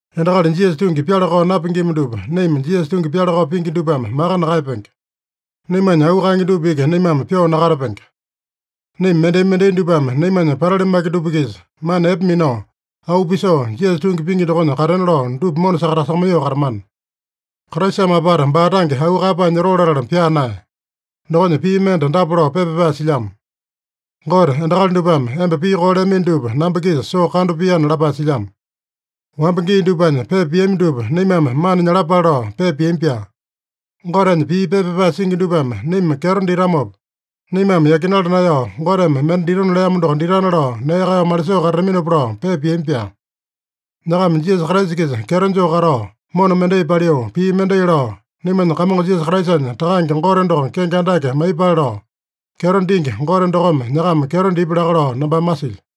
Endakali Jisasa tungi pyala-kao napingima dupa naima Jisasa tungi pyala-kao pingi dupame maka nakaeyapenge. Naimanya auu kaenge dupa iki naimame pyoo nakatapenge. Naima mendai-mendai dupame naimanya patali maki dupa-kisa mana epe minao, auu pisoo, Jisasa tungi pingi dokonya katena lao dupa mona sakatasakamaiyoo katamana. Kraisame apata baa tange auu kaeyapae nyotoo latala pyaa naeya. Dokonya pii mende dapa lao pepa pyapae silyamo: “Gote, endakali dupame emba pii koo leamino dupa namba-kisa soo kando piana” lapae silyamo. Wamba gii dupanya pepa piami dupa naimame mana nyalapale lao pepa piami-pyaa. Gotenya pii pepa pyapae singi dupame naima kyeto ditamopa, naimame yakinala naeyao, Goteme mende ditona leamo doko ditana lao nee kaeyao malisoo katataminopa lao pepa piami-pyaa. Nyakama Jisasa Kraisa-kisa kyeto joo katao, mona mendai paliu, pii mendai lao, naimanya Kamongo Jisasa Kraisanya Takange Gote doko kenge andake maiyepale lao, kyeto dingi Gote dokome nyakama kyeto dipya laka lao nambame masilyo.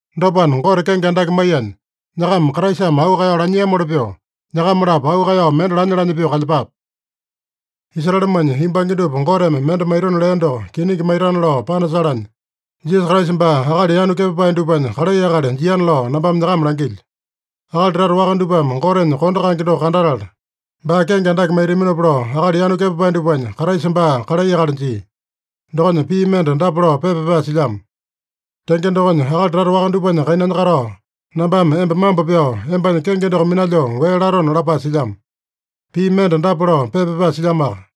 Dopana, Gote kenge andake maiyanya, nyakama Kraisame auu kaeyao lanyiamoli pyoo, nyakama-lapo auu kaeyao mende lanya-lanya pyoo kalyepape. Israelemanya yumbange dupa Goteme mende maitona lea doko kiningi maitana lao panasalanya, Jisasa Kraisa baa akali yanu kepapae dupanya kalai akali jiana lao nambame nyakama langilyo. Akali tata waka dupame Gotenya kondo kaenge doko kandatala, baa kenge andake maitaminopa lao akali yanu kepapae dupanya Kraisa baa kalai akali jia. Dokonya pii mende dapa lao pepa pyapae silyamo: “Tenge dokonya, akali tata waka dupanya kainanya katao, nambame emba mambo pyao, embanya kenge doko minalyoo wee latona” lapae silyamo. Pii mende dapa lao pepa pyapae silyamoaka: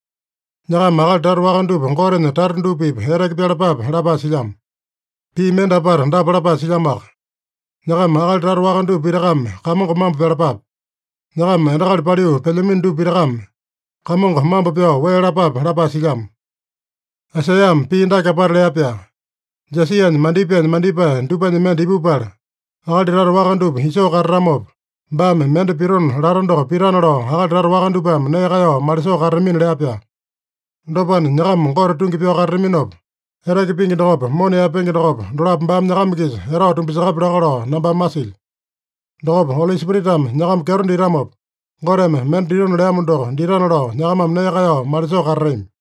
“Nyakama akali tata waka dupa Gotenya tata dupa-pipa eteke pyalapape” lapae silyamo. Pii mende apata dapa lapae silyamoaka: “Nyakama akali tata waka dupa pitakame Kamongo mambo pyalapape. Nyakama endakali paliu pelyamino dupa pitakame Kamongo mambo pyao wee lapape” lapae silyamo. Aisaiyame pii dake apata lea-pyaa: “Jesianya mandipaenya mandipae dupanya mende ipupala, akali tata waka dupa isoo katatamopa, baame mende pitona lata doko pitana lao akali tata waka dupame nee kaeyao malisoo katatamina” lea-pyaa. Dopana, nyakama Gote tungi pyao katataminopa, eteke pingi dokopa, mona yaepenge dokopa, dolapo baame nyakama-kisa etao tumbasakapya laka lao nambame masilyo. Dokopa Oli Spiritame nyakama kyeto ditamopa, Goteme mende ditona leamo doko ditana lao nyakamame nee kaeyao malisoo katatami.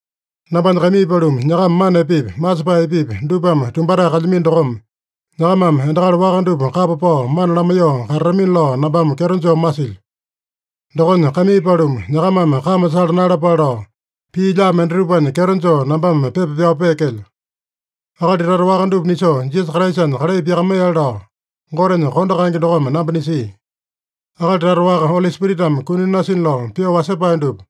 Nambanya kaimii paluma, nyakama mana epepi, masepae epepi, dupame tumbatae kalyamino dokome, nyakamame endakali waka dupa kapa pao mana lamaiyoo katatamina lao nambame kyeto joo masilyo. Dokonya, kaimii paluma, nyakamame kame sala naeyalapale lao, pii lyaa mendatupanya kyeto joo nambame pepa pyao peekelyo. Akali tata waka dupa nisoo Jisasa Kraisanya kalai pyakamaiyale lao Gotenya kondo kaenge dokome namba nisia. Akali tata waka, Oli Spiritame kuni nasina lao pyoo wasepae dupa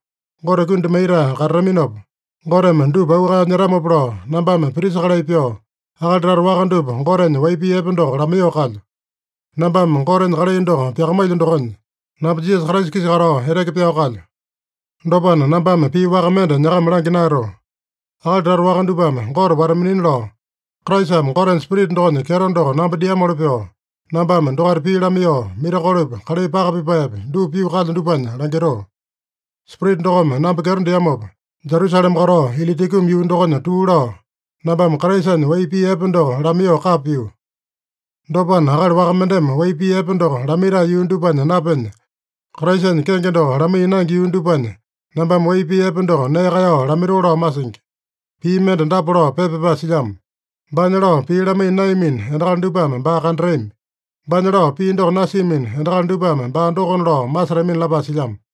Gote kundi maitae katataminopa, Goteme dupa auu kaeyao nyetamopa lao, nambame prisa kalai pyoo, akali tata waka dupa Gotenya wai pii epe doko lamaiyoo kalyo. Nambame Gotenya kalai doko pyakamailyo dokonya, namba Jisasa Kraisa-kisa katao eteke pyao kalyo. Dopana, nambame pii waka mende nyakama langya naeyatoo. Akali tata waka dupame Gote wata-minina lao, Kraisame Gotenya Spirita dokonya kyeto doko namba diamoli pyoo, nambame dokaita pii lamaiyoo, mirakolopi, kalai paka pipaepi, dupa pyoo kalyo dupanya langitoo. Spirita dokome namba kyeto diamopa, Jerusalema katao Ilitikumu yuu dokonya tuu lao, nambame Kraisanya wai pii epe doko lamaiyoo kapa pio. Dopana, akali waka mendeme wai pii epe doko lamaitae yuu dupanya napenya, Kraisanya kenge doko lamaiya naenge yuu dupanya nambame wai pii epe doko nee kaeyao lamaitoo lao masingi. Pii mende dapa lao pepa pyapae silyamo: “Baanya lao pii lamaiya naeyamino endakali dupame baa kandatami. Baanya lao pii doko nasiamino endakali dupame baa dokona lao masetamina” lapae silyamo.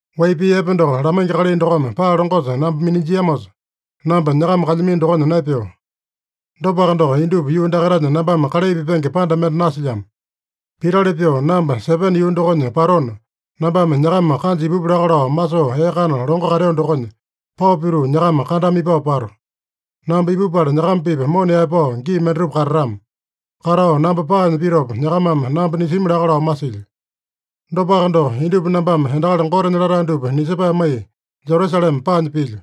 Wai pii epe doko lamaingi kalai dokome paa longosa namba minanjiamosa, namba nyakama kalyamino dokonya naepeo. Dopaka doko, indupa yuu dakaitanya nambame kalai pipenge panda mende nasilyamo. Pitali pyoo namba Sepene yuu dokonya patona, nambame nyakama kanja ipupu laka lao masoo ee kana longo kateo dokonya, pao pituu nyakama kandama ipao pato. Namba ipupala nyakama-pipa mona yaepao gii mendatupa katatama. Katao namba paanya pitopa, nyakamame namba nisimi laka lao masilyo. Dopaka doko, indupa nambame endakali Gotenya latae dupa nisepae maiya Jerusalema paanya pilyo.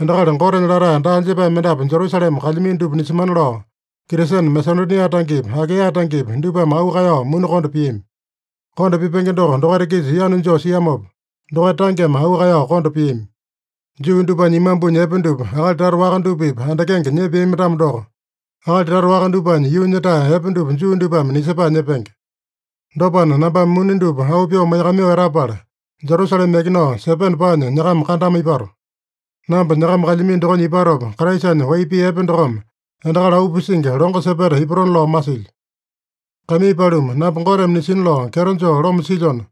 Endakali Gotenya latae daa jepae mendapu Jerusalema kalyamino dupa nisemana lao, Kristene Masedonia tangepi, Akaeya tangepi, dupame auu kaeyao muni konda piami. Kondo pipenge doko dokaita-kisa yanu joo siamopa, dokaita tangeme auu kaeyao konda piami. Juu dupanya imambunya epe dupa, akali tata waka dupa-pipa andakenge nyepeami-tamo doko, akali tata waka dupanya yuunya-tae epe dupa Juu dupame nisepae nyepenge. Dopana, nambame muni dupa auu pyoo maiyakamaiyoo etapala, Jerusalema yakinao Sepene paanya nyakama kandama ipato. Namba nyakama kalyamino dokonya ipatopa, Kraisanya wai pii epe dokome endakali auu pisingi longo sepeta ipatona lao masilyo. Kaimii paluma, namba Goteme nisina lao kyeto joo loma silyona,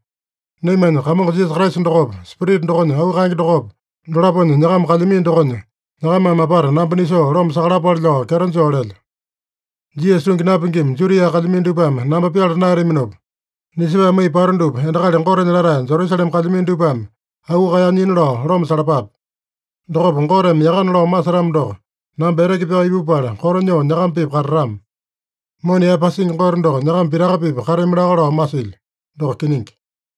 naimanya Kamongo Jisasa Kraisa dokopa, Spirita dokonya auu kaenge dokopa, dolaponya nyakama kalyamino dokonya, nyakamame apata namba nisoo loma sakalapale lao kyeto joo lelyo. Jisasa tungi napingima Judia kalyamino dupame namba pyala naeyataminopa, nisepae maiya pato dupa endakali Gotenya latae Jerusalema kalyamino dupame auu kaeyao nyina lao loma salapape. Dokopa Goteme yakana lao masetamo doko, namba eteke pyao ipupala, koto nyoo nyakama-pipa katatama. Mona yaepasingi Gote doko nyakama pitaka-pipa katami laka lao masilyo. Doko kiningi.